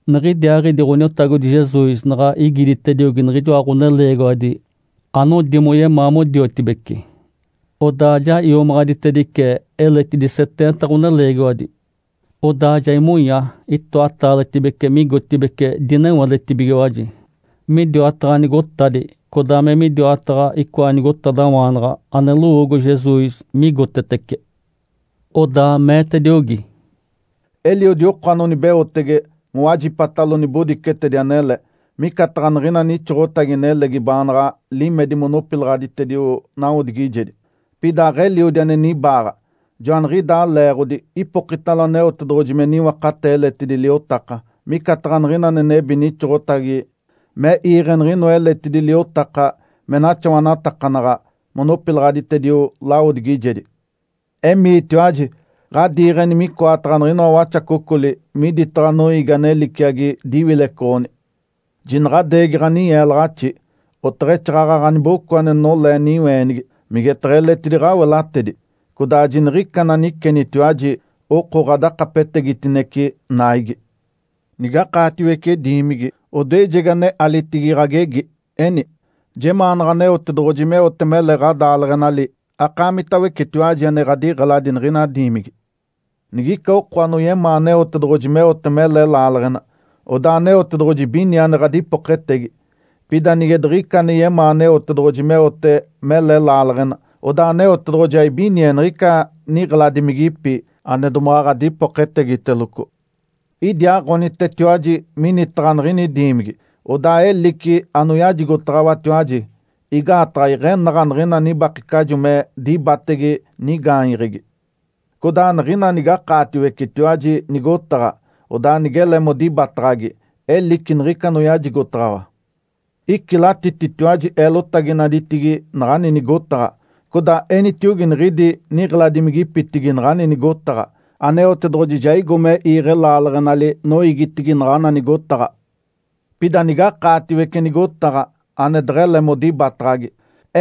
Niɡ̶idiaaɡ̶idi Ǥoniotagodi Jesus naɡ̶a igiditediogi niɡ̶ijoa ɡ̶oneleegiwadi anodi moyemaa modiotibece, odaa ja iomaɡ̶aditedice eletidi seteenta ɡ̶oneleegiwadi. Odaa ja imonya itoataaletibece migotibeci dinewadetibigiwaji, midiwataɡ̶a nigotadi, codaa me midiwataɡ̶a icoa nigotadawaanaɡ̶a ane lowoogo Jesus migotetece. Odaa meetediogi, “Eliodi oko anonibeotege mowajipatalo nibodicetedi anele, micataɡ̶a niɡ̶ina nixoɡ̶otagi nelegi baanaɡ̶a limedi monopilaɡ̶aditedio nawodigijedi, pida aɡ̶eliodi ane nibaaɡ̶a. Joaniɡ̶idaa leeɡ̶odi ipokitalo Aneotedoɡ̶oji me niwakatee eletidi liotaka. Micataɡ̶a niɡ̶ina ane nebi nixoɡ̶otagi me iiɡ̶e niɡ̶inoa eletidi liotaka me naxawanatakanaɡ̶a monopilaɡ̶aditedio lawodigijedi. Emiitiwaji! Ǥadiiɡ̶eni micoataɡ̶a niɡ̶inoa waxacocoli miditaɡ̶a noiigi ane liciagi diwilecoɡ̶oni. Jinaɡ̶adeegi ɡ̶aninyeelaɡ̶axi, oteɡ̶exaaɡ̶aɡ̶a ɡ̶aniboco ane nolee niweenigi, migetaɡ̶a eletidi ɡ̶awelatedi. Codaa jiniɡ̶ica ananicenitiwaji oko ɡ̶adakapetegitinece naigi. Nigakaatiwece diimigi, odoejegi ane alitigi ɡ̶agegi, eni, ‘Jemaanaɡ̶a Aneotedoɡ̶oji meote mele ɡ̶adaaleɡ̶enali akaamitawecetiwaji ane ɡ̶adiɡ̶eladi niɡ̶ina diimigi.’ Nigica oko anoyemaa Aneotedoɡ̶oji meote mele laaleɡ̶ena, odaa Aneotedoɡ̶oji ibinie ane ɡ̶adipoketegi. Pida nige diɡ̶ica ane yemaa Aneotedoɡ̶oji meote mele laaleɡ̶ena, odaa Aneotedoɡ̶oji aibinie niɡ̶ica niɡ̶eladimigipi, ane domaɡ̶a ɡ̶adipoketegiteloco. Idiaaɡ̶onitetiwaji minitaɡ̶a niɡ̶ini diimigi, odaa elici anoyajigotaɡ̶awatiwaji. Igaataɡ̶a iɡ̶enaɡ̶a niɡ̶ina nibakecajo me dibatege nigaanyeɡ̶egi. Codaa niɡ̶ina nigakaatiwecetiwaji nigotaɡ̶a, odaa nigele modibataɡ̶agi, elici niɡ̶ica anoyajigotaɡ̶awa. Icilatititiwaji eelotaginaditigi naɡ̶ani nigotaɡ̶a, codaa enitiogi niɡ̶idi niɡ̶eladimigipitigi naɡ̶ani nigotaɡ̶a, ‘Aneotedoɡ̶oji ja igo me iiɡ̶e laaleɡ̶enali noiigitigi naɡ̶ana nigotaɡ̶a’. Pida nigakaatiwece nigotaɡ̶a ane deɡ̶ele modibataɡ̶agi,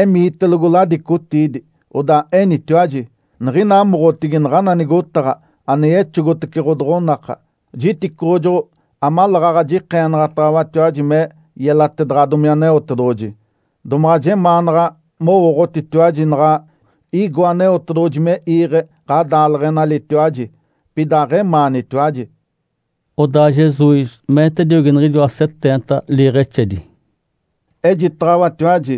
emiitelogo ladicotiidi, odaa enitiwaji, ‘Niɡ̶ina amoɡ̶otigi naɡ̶ana nigotaɡ̶a ane yexogotece ɡ̶odoɡ̶onaka, jiticoɡ̶ojoɡ̶o amaleeɡ̶aɡ̶a jikeenaɡ̶ataɡ̶awatiwaji me yelatedaɡ̶adomi Aneotedoɡ̶oji. Domaɡ̶a jemaanaɡ̶a mowooɡ̶otitiwaji naɡ̶a igo Aneotedoɡ̶oji me iiɡ̶e ɡ̶adaaleɡ̶enalitiwaji, pida aɡ̶emaanitiwaji.’” Odaa Jesus meetediogi niɡ̶ijoa seteenta liiɡ̶exedi, “Ejitaɡ̶awatiwaji,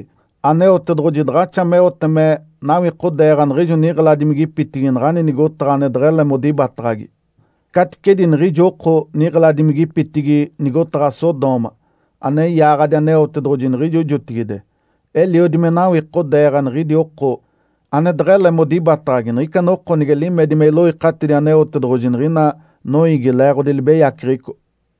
Aneotedoɡ̶oji daɡ̶axa meote me nawikodeeɡ̶a niɡ̶ijo niɡ̶eladimigipitigi naɡ̶ani nigotaɡ̶a ane deɡ̶ele modibataɡ̶agi, caticedi niɡ̶ijo oko niɡ̶eladimigipitigi nigotaɡ̶a Sodoma, ane yaaɡ̶adi Aneotedoɡ̶oji niɡ̶ijo jotigide. Eliodi me nawikodeeɡ̶a niɡ̶idi oko ane deɡ̶ele modibataɡ̶agi niɡ̶ica noko nige limedi me iloikatidi Aneotedoɡ̶oji niɡ̶ina noiigi leeɡ̶odi libeyaceɡ̶eco.”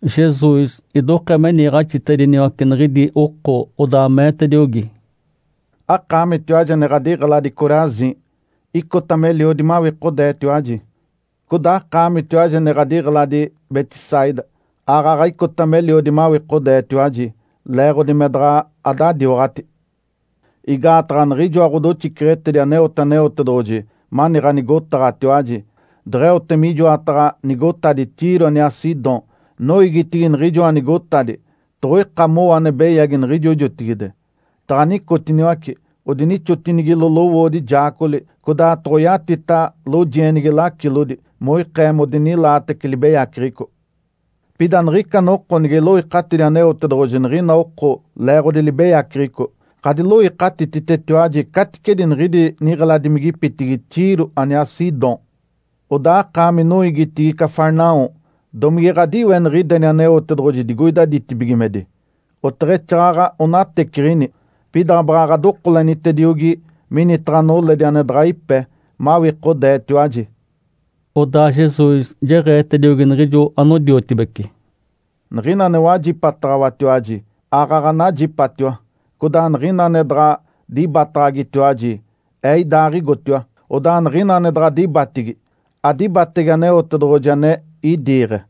Jesus idokee me niiɡ̶axitediniwace niɡ̶idi oko, odaa meetediogi, “Akaamitiwaji ane ɡ̶adiɡ̶eladi Corazim, icota meliodi mawikodeetiwaji. Codaa akaamitiwaji ane ɡ̶adiɡ̶eladi Betsaida aaɡ̶aɡ̶a icota meliodi mawikodeetiwaji, leeɡ̶odi me daɡ̶a adadiwaɡ̶ati. Igaataɡ̶a niɡ̶ijoa ɡ̶odoxiceɡ̶etedi aneote Aneotedoɡ̶oji mani ɡ̶anigotaɡ̶atiwaji, deɡ̶eote mijoataɡ̶a nigotadi Tiro aniaa Sidom, noiigitigi niɡ̶ijoa nigotadi toɡ̶oika mowo ane beyagi niɡ̶ijo jotigide. Taɡ̶a nicotiniwace, odinixotinigilo lowoodi jaacogoli, codaa toɡ̶oyatita lojienigi lacilodi, moikee modinilaatece libeyaceɡ̶eco. Pida niɡ̶ica noko nige iloikatidi Aneotedoɡ̶oji niɡ̶ina oko leeɡ̶odi libeyaceɡ̶eco, ɡ̶adiloikatititetiwaji caticedi niɡ̶idi niɡ̶eladimigipitigi Tiro aniaa Sidom. Odaa akaami noiigitigi Cafarnaum, domige ɡ̶adiweniɡ̶ideni Aneotedoɡ̶oji digoida ditibigimedi? Oteɡ̶exaaɡ̶aɡ̶a onateciɡ̶ini! Pida baɡ̶a ɡ̶adokolenitediogi minitaɡ̶a noledi ane daɡ̶a ipe, mawikodeetiwaji.” Odaa Jesus jeɡ̶eetediogi niɡ̶ijo anodiotibece, “Niɡ̶ina ane wajipataɡ̶awatiwaji, aaɡ̶aɡ̶a najipatiwa. Codaa niɡ̶ina ane daɡ̶a dibataɡ̶agitiwaji, Ee idaaɡ̶igotiwa. Odaa niɡ̶ina ane daɡ̶a dibatigi, adibatege Aneotedoɡ̶oji ane idiiɡ̶e.”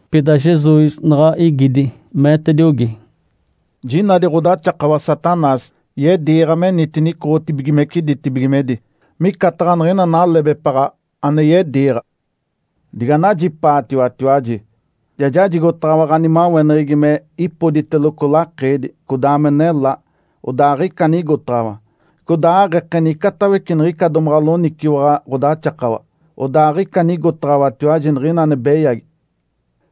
Pida Jesus naɡ̶a igidi, meetediogi, “Jinadi ɡ̶odaxakawa Satanás yediiɡ̶a menitini icoɡ̶otibigimece ditibigimedi, micataɡ̶a niɡ̶ina nalebepaɡ̶a ane yediiɡ̶a. Diganajipaatiwatiwaji! Ja jajigotaɡ̶awa ɡ̶animaweneɡ̶egi me ipoditeloco lakeedi, codaa me nelá. (Odaa aɡ̶ica anigotaɡ̶awa.) Codaa aɡ̶ekeni icatawece niɡ̶ica domaɡ̶a loniciwaɡ̶a ɡ̶odaxakawa, odaa aɡ̶ica anigotaɡ̶awatiwaji niɡ̶ina ane beyagi.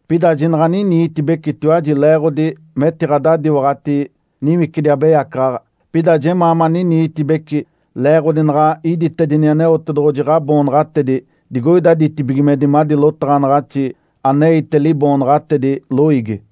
Pida jinaɡ̶a aniniitibecitiwaji leeɡ̶odi metiɡ̶adadiwaɡ̶ati niwicidi abeyacaɡ̶aɡ̶a. Pida jemaa maniniitibeci leeɡ̶odi naɡ̶a iditedini Aneotedoɡ̶oji ɡ̶aboonaɡ̶atedi digoida ditibigimedi madi lotaɡ̶anaɡ̶axi aneite liboonaɡ̶atedi loiigi.”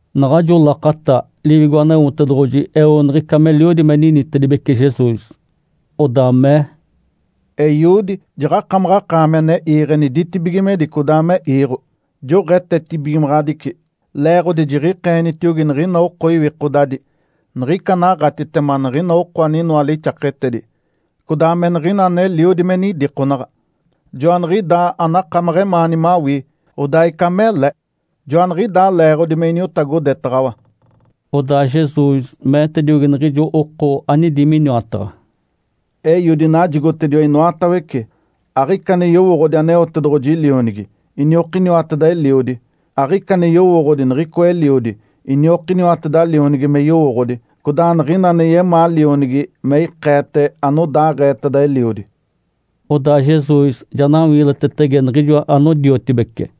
Naɡ̶ajo lakata Liwigo Aneotedoɡ̶oji eo niɡ̶ica meliodi me ninitedibece Jesus. Odaa mee, “Eiodi, jaɡ̶akamaɡ̶akaami ane iiɡ̶eni ditibigimedi, codaa me iiɡ̶o, joɡ̶etetibigimaɡ̶adici, leeɡ̶odi jiɡ̶ikeenitiogi niɡ̶ina oko iwikodadi niɡ̶ica anaɡ̶atitema niɡ̶ina oko aninoa lixaketedi, codaa me niɡ̶ina aneliodi me nidikonaɡ̶a. Joaniɡ̶idaa anakamaɡ̶a emaani mawii, odaa ica mele. Joaniɡ̶idaa leeɡ̶odi me iniotagodetaɡ̶awa.” Odaa Jesus meetediogi niɡ̶ijo oko anidi miniwataɡ̶a, “Eiodi najigotediwa inoatawece. Aɡ̶ica ane yowooɡ̶odi Aneotedoɡ̶oji Lionigi, iniokiniwateda Eliodi. Aɡ̶ica ane yowooɡ̶odi niɡ̶icoa Eliodi, iniokiniwateda Lionigi me yowooɡ̶odi, codaa niɡ̶ina ane yemaa Lionigi me ikeete anodaaɡ̶eeteda Eliodi.” Odaa Jesus ja nawiilitetetege niɡ̶ijo anodiotibece.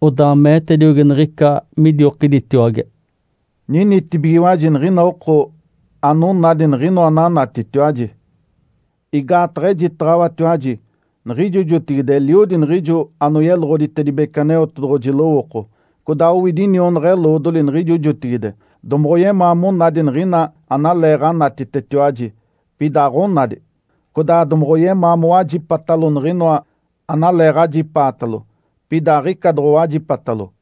Odaa meetediogi niɡ̶ica midiokiditiwage, “Ninitibigiwaji niɡ̶ina oko anonadi niɡ̶inoa ananatitiwaji! Igaataɡ̶a ejitaɡ̶awatiwaji, niɡ̶ijo jotigide eliodi niɡ̶ijo anoyeloɡ̶oditedibece Aneotedoɡ̶oji lowooko, codaa owidi inionaɡ̶a-eloodoli niɡ̶ijo jotigide, domoɡ̶oyemaa monadi niɡ̶ina analeeɡ̶anatitetiwaji, pida aɡ̶onadi. Codaa domoɡ̶oyemaa mowajipatalo niɡ̶inoa analeeɡ̶ajipaatalo, pida aɡ̶ica doɡ̶owajipatalo.”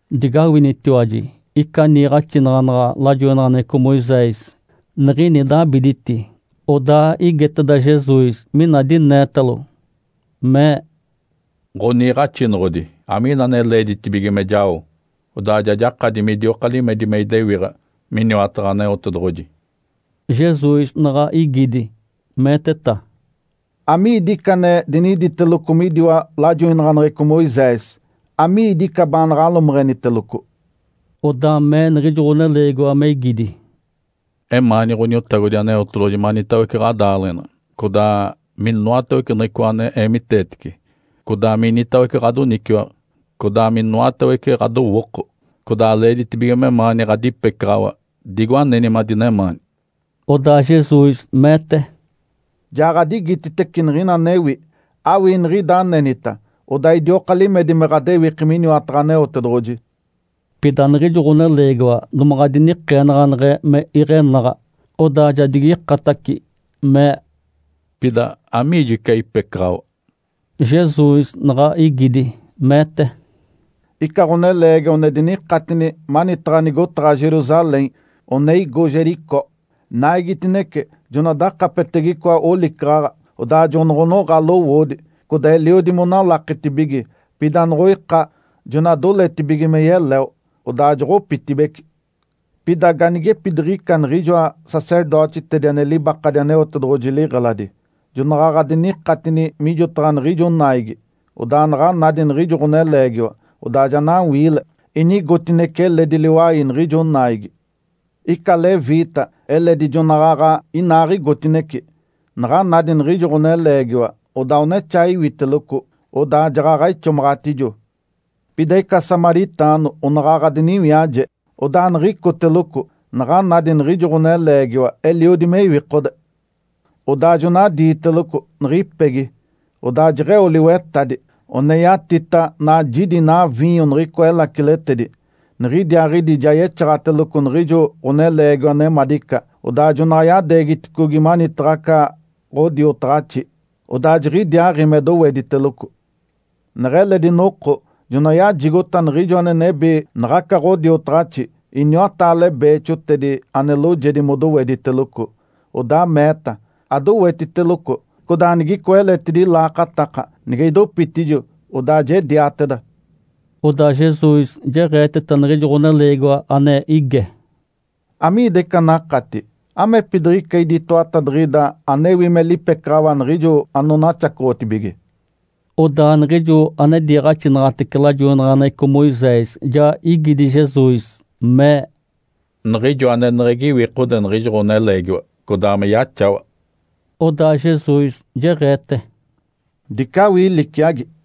Digawinitiwaji! Ica niiɡ̶axinaɡ̶anaɡ̶a lajoinaɡ̶aneɡ̶eco Moisés, niɡ̶ini dabiditi, odaa igeteda Jesus mina dineetalo, mee, “Ǥoniiɡ̶axinoɡ̶odi, amiina ane leeditibige me jao, odaa ja jakadi midioka limedi me idewiɡ̶a miniwataɡ̶a Aneotedoɡ̶oji?” Jesus naɡ̶a igidi, meeteta, “Amiidi ica ane diniditeloco midiwa lajoinaɡ̶aneɡ̶eco Moisés? Amiidi ica baanaɡ̶a alomeɡ̶eniteloco?” Odaa mee niɡ̶ijo ɡ̶oneleegiwa, me igidi, “Emaani Ǥaniotagodi Aneotedoɡ̶oji manitawece ɡ̶adaaleɡ̶ena, codaa minoatawece niɡ̶icoa ane eemiteetece, codaa minitawece ɡ̶adoniciwaɡ̶a, codaa minoatawece ɡ̶adowooko. Codaa leeditibige memaani ɡ̶adipecaɡ̶awa digo aneni madinemaani.” Odaa Jesus meete, “Jaɡ̶adigititece niɡ̶ina anewi. Awii niɡ̶ida anenita, odaa idioka limedi me ɡ̶adewiki miniwataɡ̶a Aneotedoɡ̶oji.” Pida niɡ̶ijo ɡ̶oneleegiwa domaɡ̶a dinikeenaɡ̶aneɡ̶e me iɡ̶enaɡ̶a. Odaa ja digikataci, mee, “Pida, amiijo ica ipecaɡ̶awa?” Jesus naɡ̶a igidi, meete, “Ica ɡ̶oneleegiwa one dinikatini manitaɡ̶a nigotaɡ̶a Jerusalém, one igo Jericó. Naigitinece jona dakapetege icoa olicaɡ̶aɡ̶a, odaa jonoɡ̶onoɡ̶a lowoodi, codaa eliodi monalaketibige, pida noɡ̶oika, jona doletibige me yeleo, odaa joɡ̶opitibeci. Pida ganigepidiɡ̶ica niɡ̶ijoa sacerdotitedi ane libakadi Aneotedoɡ̶oji liɡ̶eladi, jonaɡ̶aɡ̶a dinikatini mijotaɡ̶a niɡ̶ijo naigi. Odaa naɡ̶a nadi niɡ̶ijo ɡ̶oneleegiwa, odaa ja nawiile, inigotinece eledi liwai niɡ̶ijo naigi. Ica leviita eledi jonaɡ̶aɡ̶a inaaɡ̶igotinece. Naɡ̶a nadi niɡ̶ijo ɡ̶oneleegiwa, odaa onexaa iwiteloco, odaa jaɡ̶aɡ̶a ixomaɡ̶atijo. Pida ica samaritaano onaɡ̶aɡ̶a diniwiaje, odaa niɡ̶icoteloco. Naɡ̶a nadi niɡ̶ijo ɡ̶oneleegiwa eliodi me iwikode. Odaa jona diiteloco niɡ̶ipegi, odaa jeɡ̶eo liwetadi, one yatita najidi inaa viinyo niɡ̶icoa elaciletedi. Niɡ̶idiaaɡ̶idi ja yexaɡ̶ateloco niɡ̶ijo ɡ̶oneleegiwa nemadica, odaa jona yadeegiticogi manitaɡ̶a aca ɡ̶odiotaɡ̶axi, odaa jiɡ̶idiaaɡ̶i me dowediteloco. Neɡ̶eledi noko jona yajigota niɡ̶ijo ane nebi naɡ̶aca ɡ̶odiotaɡ̶axi iniwataale beexotedi ane loojedi modowediteloco. Odaa meeta, ‘Adowetiteloco, codaa nigicoa eletidi laakataka, nige idopitijo, odaa jediateda.’” Odaa Jesus jeɡ̶eeteta niɡ̶ijo ɡ̶oneleegiwa ane ige, “Amiida ica anakati? Amepidiɡ̶ica idi itoatadiɡ̶ida anewi me lipecaɡ̶awa niɡ̶ijo anonaxacoɡ̶otibige?” Odaa niɡ̶ijo ane diiɡ̶axinaɡ̶atece lajoinaɡ̶aneɡ̶eco Moisés ja igidi Jesus, mee, “Niɡ̶ijo aneneɡ̶egi iwikode niɡ̶ijo ɡ̶oneleegiwa, codaa me yaxawa.” Odaa Jesus jeɡ̶eete, “Dice awii liciagi.”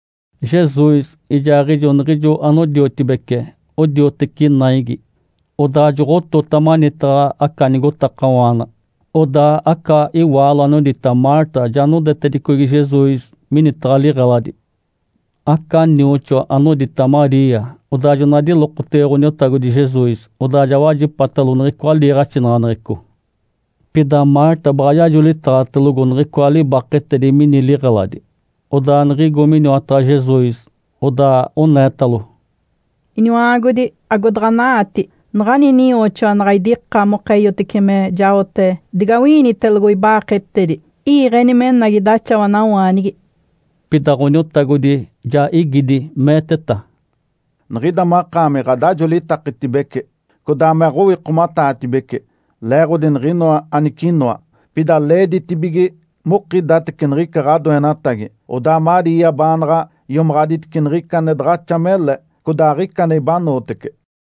Jesus ijaaɡ̶ijo niɡ̶ijo anodiotibece odioteci naigi, odaa joɡ̶otota manitaɡ̶a aca nigotakawaana. Odaa aca iwaalo anodita Marta ja nodetedicogi Jesus minitaɡ̶a liɡ̶eladi. Aca nioxoa anodita Maria, odaa jona dilokotege Ǥoniotagodi Jesus, odaa ja wajipatalo niɡ̶icoa liiɡ̶axinaɡ̶aneɡ̶eco. Pida Marta baɡ̶a yajolitaɡ̶atelogo niɡ̶icoa libaketedi mini liɡ̶eladi. Odaa niɡ̶igo miniwataɡ̶a Jesus, odaa oneetalo, “Iniwa-aagodi, agodaɡ̶ana-aati, naɡ̶ani ininyooxoa naɡ̶a idika moka eeyotece me jaote digawi-iinitelogo iba-aaketedi? Iiɡ̶eni menagi idaxawanawaanigi!” Pida Ǥoniotagodi ja igidi meeteta, “Niɡ̶ida makaami ɡ̶adajolitakitibece, codaa me aɡ̶owikomataatibece, leeɡ̶odi niɡ̶inoa anicinoa. Pida leeditibige mokidatece niɡ̶ica ɡ̶adoenatagi, odaa Maria baanaɡ̶a iomaɡ̶aditice niɡ̶ica ane daɡ̶axa mele, codaa aɡ̶ica ane ibanootece.”